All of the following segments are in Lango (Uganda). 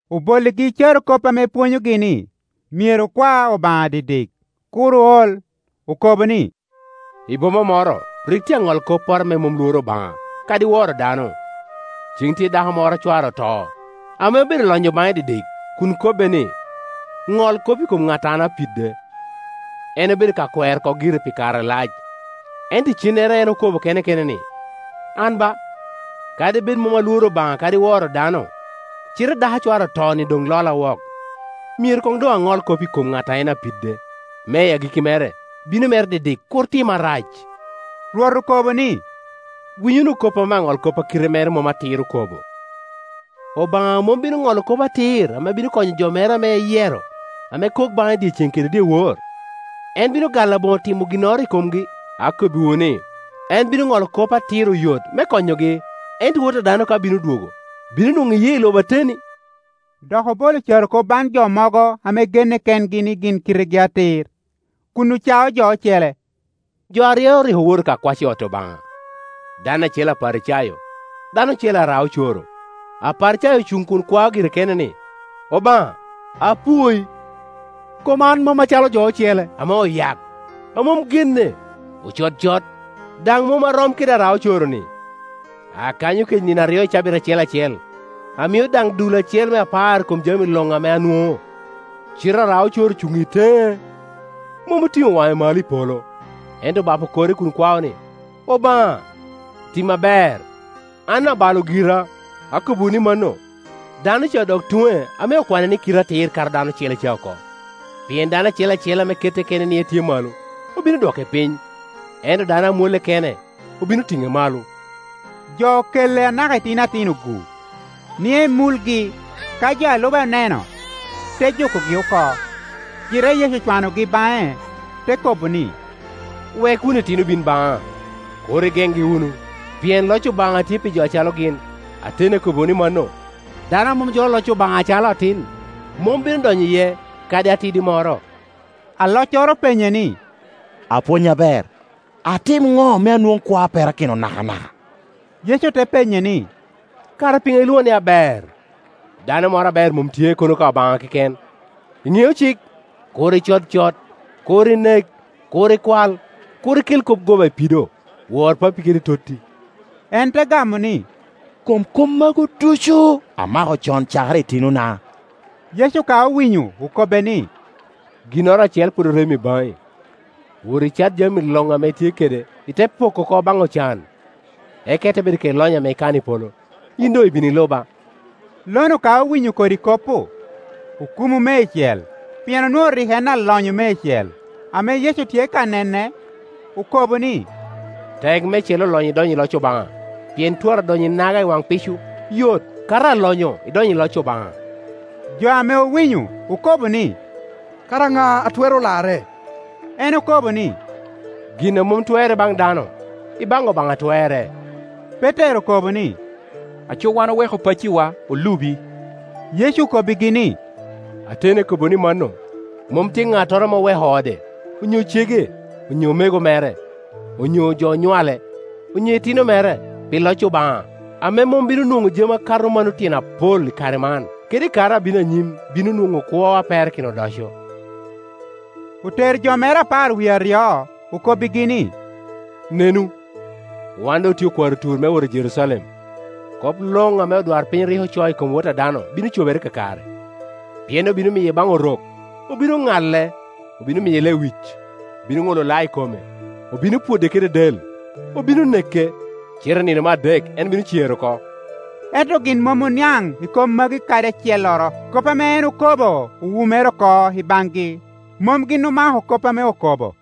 Obolligi carokop ame pwonyogi ni, myero okwa Obaŋa dikdik, kur ool. Okobo ni, “I boma moro rik tye aŋolkopporo ame mom lworo Obaŋa, kadi woro dano. Cen tye dako moro a cware oto ame obedo lonyo baŋe dikdik kun kobbe ni, ‘Ŋol kop i kom ŋat a an apidde.’ En obedo ka kwero oko gire pi kare alac; ento icennere en okobo kene kene ni, ‘An ba, kadi bed mom alworo Obaŋa kadi woro dano, cite dako a cware oto-ni doŋ lola wok; myero koŋ doŋ aŋol kop i kom ŋat a en apidde, me i agikki mere bino mere dikdik kur tima rac.’” Rwot okobo ni, “Winy wunu kop ame aŋolkop a kite mere mom atir okobo. Obaŋa mom bino Ŋolo kop atir ame bino konyo jo mere ame eyero, ame kok baŋe dyeceŋ kede dyewor? En bino gal aboŋo timo ginnoro i komgi? Akobbiwu ni, en bino Ŋolo kop atir oyot me konyogi. Ento Wot a dano ka bino dwogo, bino nwoŋo i yee i lobo ateni?” Dok obolo carokop baŋ jo mogo ame genne kengi ni gin kitegi atir, kun ocao jo ocele. “Jo aryo rik owoto ka kwac i ot Obaŋa, dano acel Aparicayo, dano ocele ara-ocoro. Aparicayo ocuŋ kun kwao gire kene ni, ‘Obaŋa, apwoi, kom an mom acalo jo ocele ame oyak, a mom genne, ocod cot, daŋ mom arom kede ara-ocoro-ni. Akanyo kec nino aryo i cabit acel acel, amio daŋ dul acel me apar i kom jami luŋ ame anwoŋo.’ Cite ara-ocoro ocuŋ i teŋe, mom otiŋo waŋe malo i polo, ento obapo kore kun kwao ni, ‘Obaŋa, tima ber, an abalo gira!’ Akobbiwu ni mano, dano ca odok tuŋe ame okwane ni kite atir kato dano ocele ca oko; pien dano acel acel ame kette kene ni etye malo, obino dwoke piny, ento dano a mwolle kene obino tiŋe malo.” Jo okelle anaka itino atino-gu, ni en mulgi. Ka jo a lube oneno, te jukogi oko. Cite Yecu ocwanogi baŋe, te kobo ni, “Wek wunu itino bin baŋa, kur igeŋgi wunu; pien loc Obaŋa tye pi jo acalo gin. Ateni akobbiwu ni mano, dano a mom jolo Ioc Obaŋa acalo atin, mom bino donyo iye kadi atidi moro.” Aloccoro openye ni, “Apwony aber, atim ŋo me anwoŋ kwo a perakino nakanaka?” Yecu te penye ni, “Kara piŋo ilwoŋa ni aber? Dano moro aber mom tye, kono ka Obaŋa keken. Iŋeo cik, ‘Kur icod cot, Kur inek, Kur ikwal, Kur ikel kop goba i pido, Wor pappi kede totti.’” En te gamo ni, “Kom kop magu ducu amako con cakere i tinona.” Yecu ka owinyo okobbe ni, “Ginnoro acel pwod orem i baŋi. Wot icat jami luŋ ame itye kede, ite poko oko baŋ ocan, eka ite bedo kede lonyo ame ikano i polo; yin doŋ ibin, iluba.” Lo-nu ka owinyo kodi kop-pu, okumu meicel, pien onwoŋo rik en alonyo meicel. Ame Yecu tye ka nene, okobo ni, “Tek meicel olonyo idonyo i loc Obaŋa! Pien twara donyo inaga i waŋ pico yot, kato alonyo idonyo i loc Obaŋa.” Jo ame owinyo okobo ni, “Kara ŋa a twero larre?” En okobo ni, “Gin a mom twerre baŋ dano, ibaŋ Obaŋa twerre.” Petero okobo ni, “Aco wan oweko pacciwa, olubi.” Yecu okobbigi ni, “Ateni akobbiwu ni mano, mom tye ŋattoro ame oweko ode, onyo cege, onyo omego mere, onyo jo onywale, onyo itino mere, pi loc Obaŋa, ame mom bino nwoŋo jami akato mano tyen apol i kare man; kede i kare a bino anyim bino nwoŋo kwo a perakino odoco.” Otero jo mere apar wie aryo, okobbigi ni, “Nenu, wan doŋ otye okwaro tur me wot i Jerucalem. Kop luŋ ame odwarpiny rik ocoo i kom Wot a dano bino cobere kakare. Pien obino miye baŋ Orok, obino ŋale, obino miye lewic, obino ŋulo lao i kome; obino pwode kede del, obino neke, cite i nino me adek en bino cer oko.” Ento gin mom oniaŋ i kop magi kadi acelloro; kop ame en okobo owumere oko i baŋgi, mom gin omako kop ame okobo.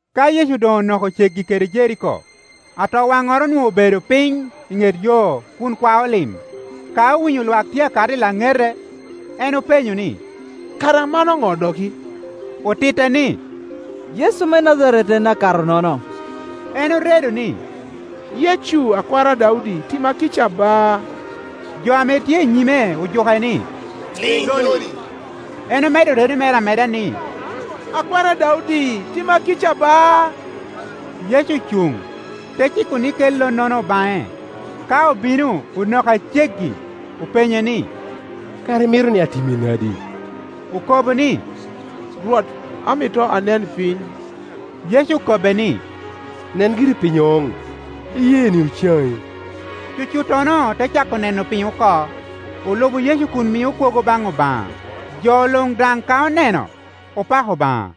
Ka Yecu doŋ onoko ceggi kede Jeriko, atowanŋoro onwoŋo obedo piny i ŋet yo kun kwao lim. Ka owinyo lwak tye a kato i laŋete, en openyo ni, “Kara mano ŋo dok i?” Otitte ni, “Yecu me Najaret en a kato-nono.” En oredo ni, “Yecu, Akwar Daudi, tima kica, ba!” Jo ame tye i nyime ojuke ni, “Liŋ lo-ni!” En omedo redo mere amede ni, “Akwar Daudi, tima kica ba!” Yecu ocuŋ, te ciko ni kel lo-nono baŋe. Ka obino onoke a ceggi, openye ni, “Kara imito ni atimi nadi?” Okobo ni, “Rwot, amito anen piny.” Yecu okobbe ni, “Nen giri piny oŋ; iyeeni ocaŋi.” Cucuttono te cako neno piny oko, olubo Yecu kun mio kwogo baŋ Obaŋa, jo luŋ daŋ ka oneno, opako Obaŋa.